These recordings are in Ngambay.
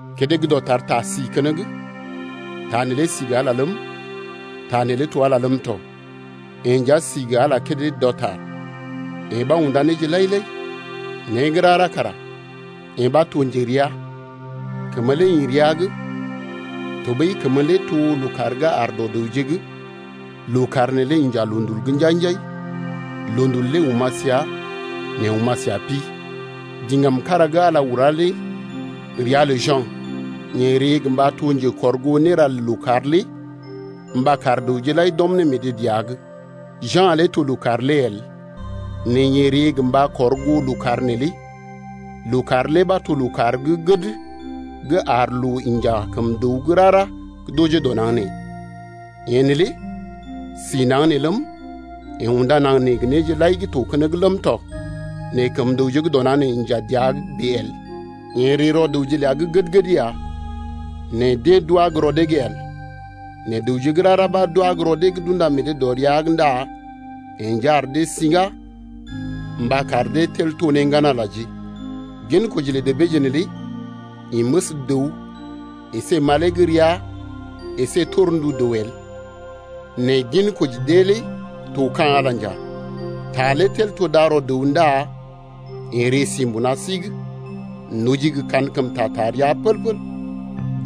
Kédé gə́ dɔtar TA si keneŋ. TA neelé si gə Ala ləm, TA neelé to Ala ləm tɔ. Yeḛ nja si gə Ala kédé gə́ dɔtar. Yeḛ ɓa unda néje lai-lai, né gə́ rara kara yeḛ ɓa to njerea. Kəmə lé ḭ rəa’g tɔɓəi kəmə lé to lookàr gə́ àr dɔ dəwje’g. Lookàr neelé inja loondul’g njai-njai, loondul lé oma̰ səa nɛ oma̰ səa pi. Diŋgam kára gə́ Ala ula lé ria lə Ja̰. Yeḛ ree gə mba to njekɔrgoo néra lə lookàr lé mba kar dəwje lai d’ɔm ne meḛ dee dəa’g. Ja̰ lé to lookàr lé el nɛ yeḛ ree gə mba kɔr goo lookàr neelé. Lookàr lé ɓa to lookàr gə́ gəd gə́ ar loo inja ne kəm dəw gə́ rara gə́ d’ojee dɔ naŋg nee. Yeḛ neelé si naŋg nee ləm, yeḛ unda naŋg nee gə néje lai gə́ to keneŋ ləm tɔ nɛ kəm dəwje gə́ dɔ naŋg nee inja dəa’g bèe el. Yeḛ ree rɔ dəwje ləa gə́ gəd-gəd ya nɛ deḛ d’wá gə́ rɔ dee’g el. Nɛ dəwje gə́ rara ɓa gə́ d’wá gə́ rɔ dee’g d’unda meḛ dee dɔ ria’g ndá yeḛ nja ar dee siŋgá gə mba kar dee tel to ne ŋgan-Alaje. Gin koji lə debeeje neelé ḭ məs dəw əsé malee gə́ rəa el nɛ gin koji dee lé to ka̰ Ala nja. TA lé tel to darɔ dəw ndá yeḛ ree si mbuna sí’g. Noji gə kankəmta taa rəa pəl-pəl.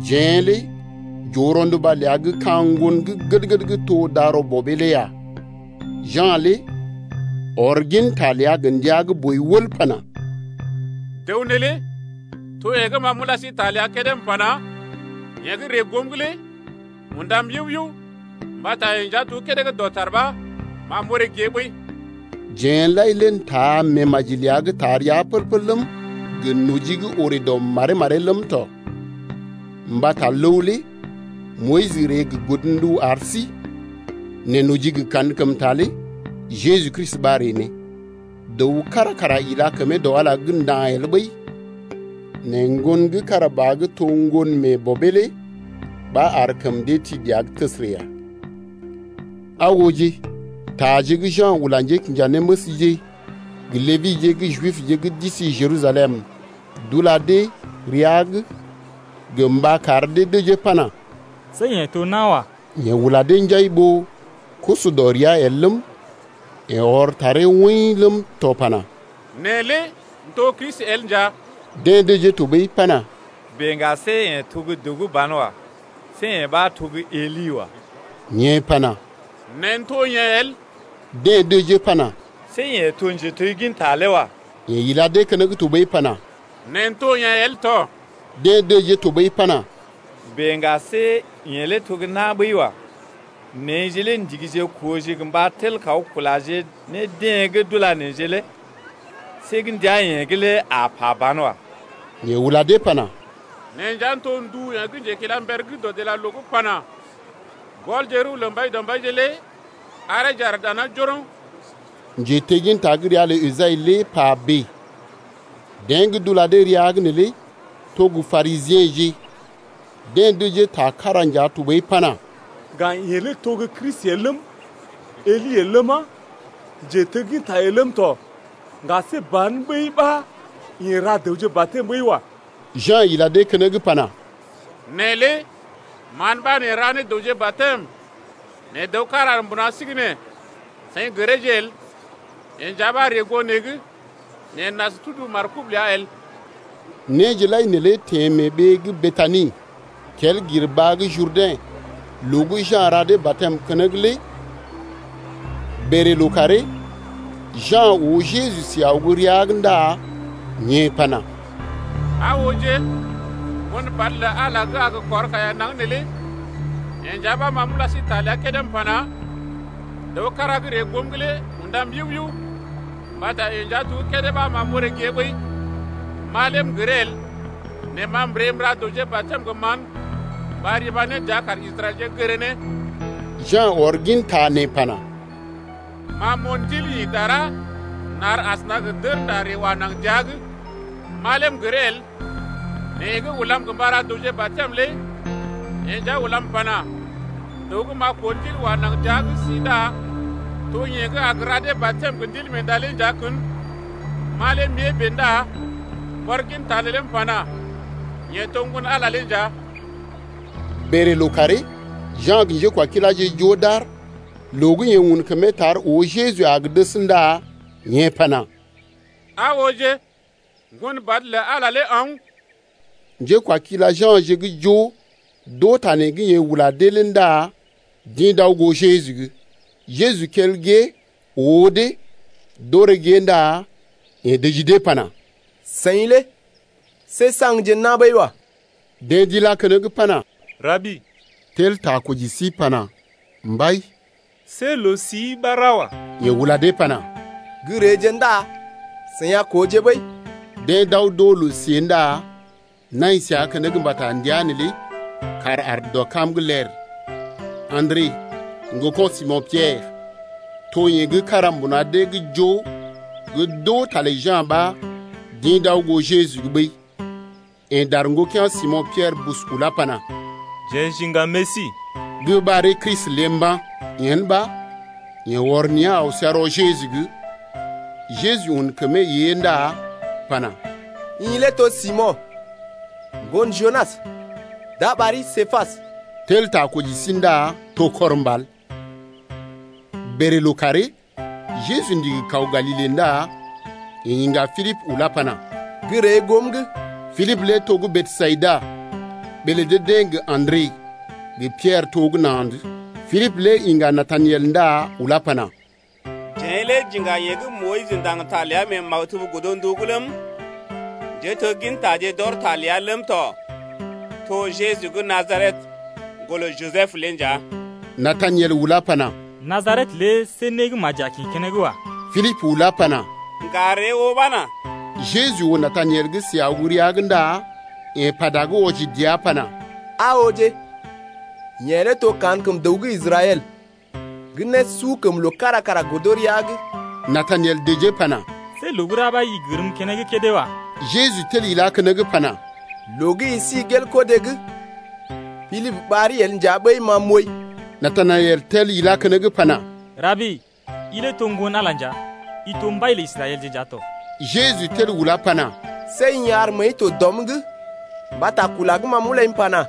Jeḛ lé j’oo rɔnduba ləa gə́ ka̰ ŋgon gə́ gəd-gəd gə́ to darɔ Bɔbee lé ya. Ja̰ lé ɔr ginta ləa gə ndia gə́ boi wəl pana: Dəw neelé to yeḛ gə́ ma m’ula sí ta ləa kédé m’pana: Yeḛ gə́ ree goom’g lé undam yiu-yiu mbata yeḛ nja to gə́ kédé gə́ dɔtar ɓa ma m’oré gée ɓəi. Jeḛje lai lé n’taaje meemaji ləa gə́ taa rəa pəl-pəl ləm, gə noji gə́ orè dɔ maree-maree ləm tɔ. Mbata ləw lé Moyis ree gə godndu ar sí nɛ noji gə kankəmta lé Jeju Kristi ɓa ree ne. Dəw kára kara ila kəmee dɔ Ala’g nda̰ el ɓəi. Nɛ Ŋgon gə́ kára ba gə́ to ŋgon mee Bɔbee lé ɓa ar kəm dee ti dəa’g təsərə ya. Aa ooje, taje gə́ Ja̰ ula njékinjanéməsje gə Lebije gə́ Jibje gə́ d’isi Jerusalem d’ula dee rəa’g gə mba kar dee dəjee pana: See i to nawa. Yeḛ ula dee njai ɓó kusu dɔ rəa el ləm, yeḛ ɔr taree woḭ ləm tɔ pana: Ma lé m’to Kristi el nja. Deḛ dəjee tɔɓəi pana: Bèe ŋga see i to gə́ dəw gə́ banwa. See i ɓa to gə́ Eli lé wa. Yeḛ pana: Ma m’to yeḛ el. Deḛ dəjee pana: See i to gə́ njetegginta lé wa. Yeḛ ila dee keneŋ tɔɓəi pana: Ma m’to yeḛ el tɔ. Deḛ dəjee tɔɓəi pana: Bèe ŋga, see i lé to gə́ na̰ ɓəi wa. Jeḛ lé jeḛ ndigije kooje gə mba tel kaw kulaje ne deḛ gə́ d’ula sí lé. See gə́ ndui-i’g lé i a pa banwa. Yeḛ ula dee pana: Ma nja m’to ndu yeḛ gə́ njekilamber gə́ dɔdilaloo’g pana: Gɔlje rəw lə Mbaidɔmbaije lé areeje aar dana njoroŋ. (Njetegginta gə́ ria lə Esai lé pa bèe.) Deḛ gə́ d’ula dee rəa’g neelé to gə́ Parisiḛje. Deḛ dəjee ta kára nja tɔɓəi pana: Ŋga i lé to gə́ Kristi el ləm, Eli el ləma, njetegginta el ləm tɔ, ŋga see ban ɓəi ɓa i ra dəwje batɛm ɓəi wa. Ja̰ ila dee keneŋ pana: Ma lé mán ɓa m’ra ne dəwje batɛm, nɛ dəw kára aar mbuna sí’g nɛ seḭ gəreeje el. Yeḛ nja ɓa ree goom’g nɛ ma m’as tudu markob ləa el. Néje lai neelé teḛ mee ɓee gə́ Betani kel gir baa gə́ Jurdɛ̰ loo gə́ Ja̰ ra dee batɛm keneŋ lé. Bèlè lookàree Ja̰ oo Jeju si aw gə́ rəa’g ndá yeḛ pana: Aa ooje, Ŋgon badə lə Ala gə́ a gə kɔr kaiya naŋg neelé. Yeḛ nja ɓa ma m’ula sí ta ləa kédé m’pana: Dəw kára gə́ ree goom’g lé undam yiu-yiu mbata yeḛ nja to gə́ kédé ɓa ma m’oré gée ɓəi. Ma lé m’gəree el nɛ ma m’ree m’ra dəwje batɛm gə mán mba riba ne dəa kar Israɛlje gəree ne. Ja̰ ɔr ginta nee pana: Ma m’oo Ndil ḭ dara nar asəna gə dərnda ree si dəa’g. Ma lé m’gəree el nɛ yeḛ gə́ ulam mba ra dəwje batɛm lé yeḛ nja ulam pana: Dəw gə́ m’a koo Ndil wa naŋg dəa’g si ndá to yeḛ gə́ a ra dee batɛm gə Ndilmeenda lé nja kən. Ma lé m’ée bèe ndá m’ɔr ginta neelé m’pana: Yeḛ to Ŋgon-Ala lé nja. Bèlè lookàree, Ja̰ gə njékwakiláje joo d’aar. Loo gə́ yeḛ un kəmee tar oo Jeju a gə dəs ndá yeḛ pana: Aa ooje, Ŋgon ɓad lə Ala lé aw’n. Njékwakila Ja̰je gə́ joo d’oo ta nee gə́ yeḛ ula dee lé ndá d’ḭ d’aw goo Jeju’g. Jeju kel gée oo dee d’orè gée ndá yeḛ dəji dee pana: Seḭ lé see saŋgje na̰ ɓəi wa. Deḛ d’ilá keneŋ pana: Rabi, (tel ta koji sí pana: Mbai), see loo-sii ɓa ra wa. Yeḛ ula dee pana: Gə́ reeje ndá seḭ a kooje ɓəi. Deḛ d’aw d’oo loo-siée ndá nai səa keneŋ mbata ndəa neelé kàr aar dɔ kam’g ler. Andre, ŋgoko̰ Simo̰ Piɛrə, to yeḛ gə́ kára mbuna dee’g joo gə́ d’oo ta lə Ja̰ ɓa d’ḭ d’aw goo Jeju’g ɓəi. Yeḛ dar ŋgokea̰ Simo̰ Piɛrə bus ulá pana: Jeḛ j’iŋga Mesi (gə́ ɓaree Kristi lé) mba̰. Yen ɓa yeḛ ɔr nea̰ aw səa rɔ Jeju’g. Jeju un kəmee ée ndá pana: I lé to Simo̰, ŋgon Junas. D’a ɓari Képas (tel ta koji sí ndá to kɔr mbal.) Bèlè lookàree Jeju ndigi kaw Galile ndá yeḛ iŋga Pilibə ulá pana: Gə́ ree goom’g. Pilibə lé to gə́ Besayida, ɓee lə dee-deḛ gə Andre gə Piɛrə to gə́ na̰’d. Pilibə lé iŋga Natanaɛl ndá ulá pana: Jeḛ lé j’iŋga yeḛ gə́ Moyis ndaŋg ta ləa mee maktub godndu’g ləm, njéteggintaje d’ɔr ta ləa ləm tɔ, to Jeju gə́ Najaret, ŋgolə Jisəb lé nja. Natanaɛl ulá pana: Najaret lé see né gə́ maji a kḭ keneŋ wa. Pilibə ulá pana: Ŋga ree oo ɓa nà. Jeju oo Natanaɛl gə́ si aw gə́ rəa’g ndá yeḛ pata gə́ wɔji dəa pana: Aa ooje, yeḛ lé to kankəm dəw gə́ Israɛl gə́ nésukəmloo kára kara godo rəa’g. Natanaɛl dəjee pana: See loo gə́ ra ɓa i gərm keneŋ kédé wa. Jeju tel ilá keneŋ pana, Loo gə́ i si gel kodé’g, Pilibə ɓari el nja ɓəi ma m’ooi. Natanaɛl tel ilá keneŋ pana: Rabi, i lé to Ŋgon-Ala nja, i to mbai lə Israɛlje nja tɔ. Jeju tel ulá pana: See i ar məəi to dɔm’g mbata kula gə́ ma m’ulai m’pana: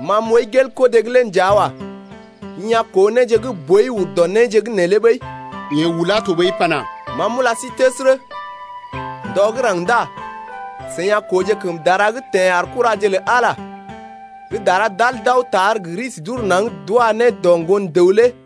Ma m’ooi gel kodé’g lé nja wa. I a koo néje gə́ boi ur dɔ néje’g neelé ɓəi. Yeḛ ulá tɔɓəi pana: Ma m’ula sí təsərə, ndɔ gə́ raŋg ndá seḭ a kooje kəm dara gə́ teḛ ar kuraje lə Ala gə́ dara d’al d’aw tar gə risi d’ur naŋg d’wa ne dɔ Ŋgon dəw lé.